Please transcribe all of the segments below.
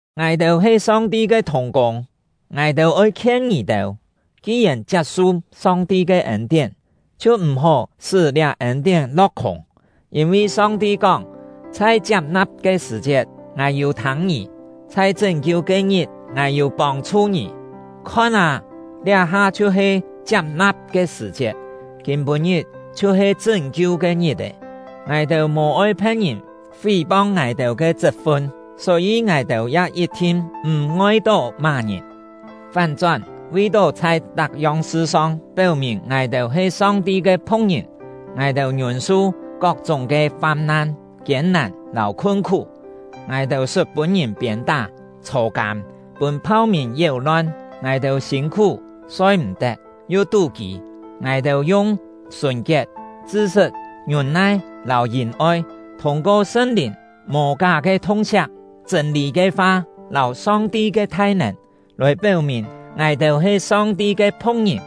Ngài-têu he Song-ti ke thùng-kûng; ngài-têu oi khien ngì-têu: Ki-yèn chiap-su Song-ti ke ên-tién, chhiu m̀-hó sṳ́ liá ên-tién lo̍k-khûng. Yîn-vi Song-ti kóng: Chhai chiap-na̍p ke sṳ̀-chiet, Ngài yû thâng ngì; chhai chṳ́n-kiu ke-ngit, Ngài yû pông-chhu ngì. Khon â! Liá-ha chhiu-he chiap-na̍p ke sṳ̀-chiet, kîm-pû-ngit chhiu-he chṳ́n-kiu ke ngit-è! Ngài-têu mò-oi phe̍t-ngìn fí-pong ngài-têu ke chṳt-fun, só-yî ngài-têu ya yit-thin m̀ ngoi-tó má-ngìn; fán-chón, vi-tó chhai tak-yong sṳ-song péu-mìn ngài-têu he Song-ti ke phu̍k-ngìn, ngài-têu ngiûn-su kok-chúng ke fam-nan, kiên-nàn, lâu khun-khú. Ngài-têu sṳt pûn-ngìn piên-tá, chhô-kâm, pûn phau-mìn yéu-lon; ngài-têu sîn-khú, soi-m̀-tet, yu tú-kî. Ngài-têu yung sùn-kiet, chṳ-sṳt, ngiûn-nai lâu yìn-oi, thûng-ko Sṳn-Lìn, mò ká ke thung-siak, chṳ̂n-lî ke fa, lâu Song-ti ke thai-nèn, lòi péu-mìn ngài-têu he Song-ti ke phu̍k-ngìn.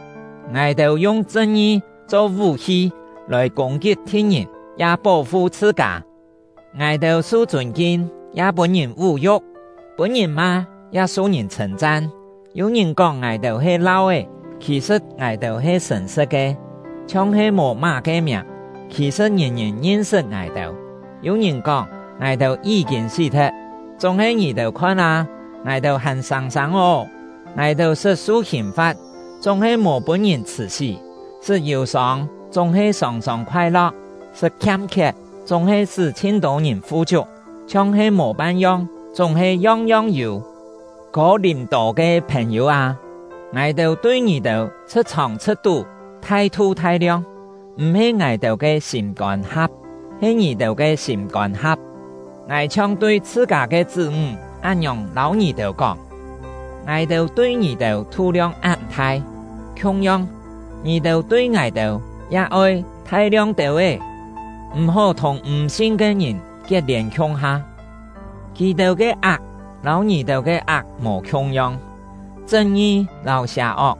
Ngài-têu yung chṳn-ngi cho vú-hi lòi kûng-kit thi̍t-ngìn, ya pó-fu chhṳ-kâ. Ngài-têu su chûn-kin, ya pûn-ngìn vú-yu̍k; pûn-ngìn ma, ya su chhṳ̂n-chan. Yû-ngìn kóng ngài-têu he lau-é, khì-sṳ̍t ngài-têu he sṳ̀n-sṳ̍t ke; chhiong he mò má-ke miàng, khì-sṳ̍t ngìn-ngìn ngin-sṳt ngài-têu; yû-ngìn kóng ngài-têu yí-kîn sí-thet, chúng-he ngì-têu khon â, ngài-têu hàn sâng-sâng ô. Ngài-têu sṳt su hìn-fa̍t, chúng-he mò pûn-ngìn chhṳ̀-sí; sṳt yù-sông, chúng-he sòng-sòng khoai-lo̍k; sṳt khiam-khiet, chúng-he sṳ́ chhin-tô ngìn fu-chiuk; chhiong he mò pan-yong, chúng-he yong-yong yû. Kô-lìm-tô ke phèn-yû â, ngài-têu tui ngì-têu chhṳ̍t-chhòng chhṳ̍t-tú thai-thu thai-liong. M̀-he ngài-têu ke sîm-kôn ha̍p, he ngì-têu ke sîm-kôn ha̍p. Ngài chhiong tui chhṳ-kâ ke chṳ́-ńg án-ngiòng lâu ngì-têu kóng: Ngài-têu tui ngì-têu tú-liong án thai, khiung-yong, ngì-têu tui ngài-têu ya oi thai-liong têu-é! M̀-hó thùng m̀ sin ke ngìn kiet-lièn khiung-ha; kì-têu ke ak lâu ngì-têu ke ak mò khiung-yong. Chṳn-ngi lâu sià-ok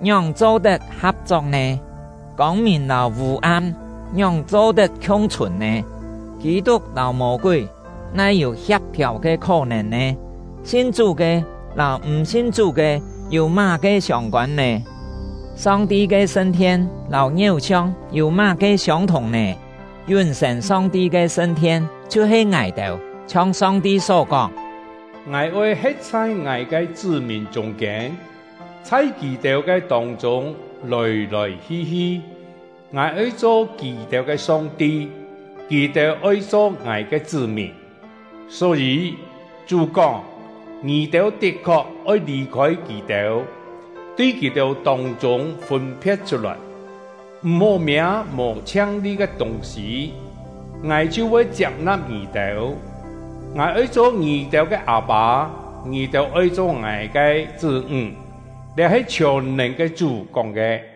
ngióng cho-tet ha̍p-chok nè? Kông-mìn lâu vû-am ngióng cho-tet khiung-chhùn nè? Kî-tuk lâu Mô-kúi nai yû hia̍p-thiàu ke khó-nèn nè? Sin Chú ke lâu m̀ sin Chú ke yû má-ke siông-kôn nè? Song-ti ke sṳn-thien lâu ngiéu-siong yû má-ke siông-thùng nè? Yún-sên Song-ti ke sṳn-thien chhiu-he ngài-têu. Chhiong Song-ti só kóng: Ngài oi he̍t chhai Ngài ke chṳ́-mìn chûng-kiên, chhai kì-têu ke tông-chûng lòi-lòi hi-hi. Ngài oi cho kì-têu ke Song-ti; kì-têu oi cho Ngài ke chṳ́-mìn. Só-yî, Chú kóng: Ngì-têu tit-khok oi lì-khôi kì-têu, tui kì-têu tông-chûng fûn-phe̍t chhut-lòi; m̀-hó miâ mò chhiang-li ke tûng-sî, Ngài chhiu voi chiap-na̍p ngì-têu. Ngài oi cho ngì-têu ke Â-pâ; ngì-têu oi cho Ngài ke chṳ́-ńg. Liá he chhiòn-nèn ke Chú kóng ke.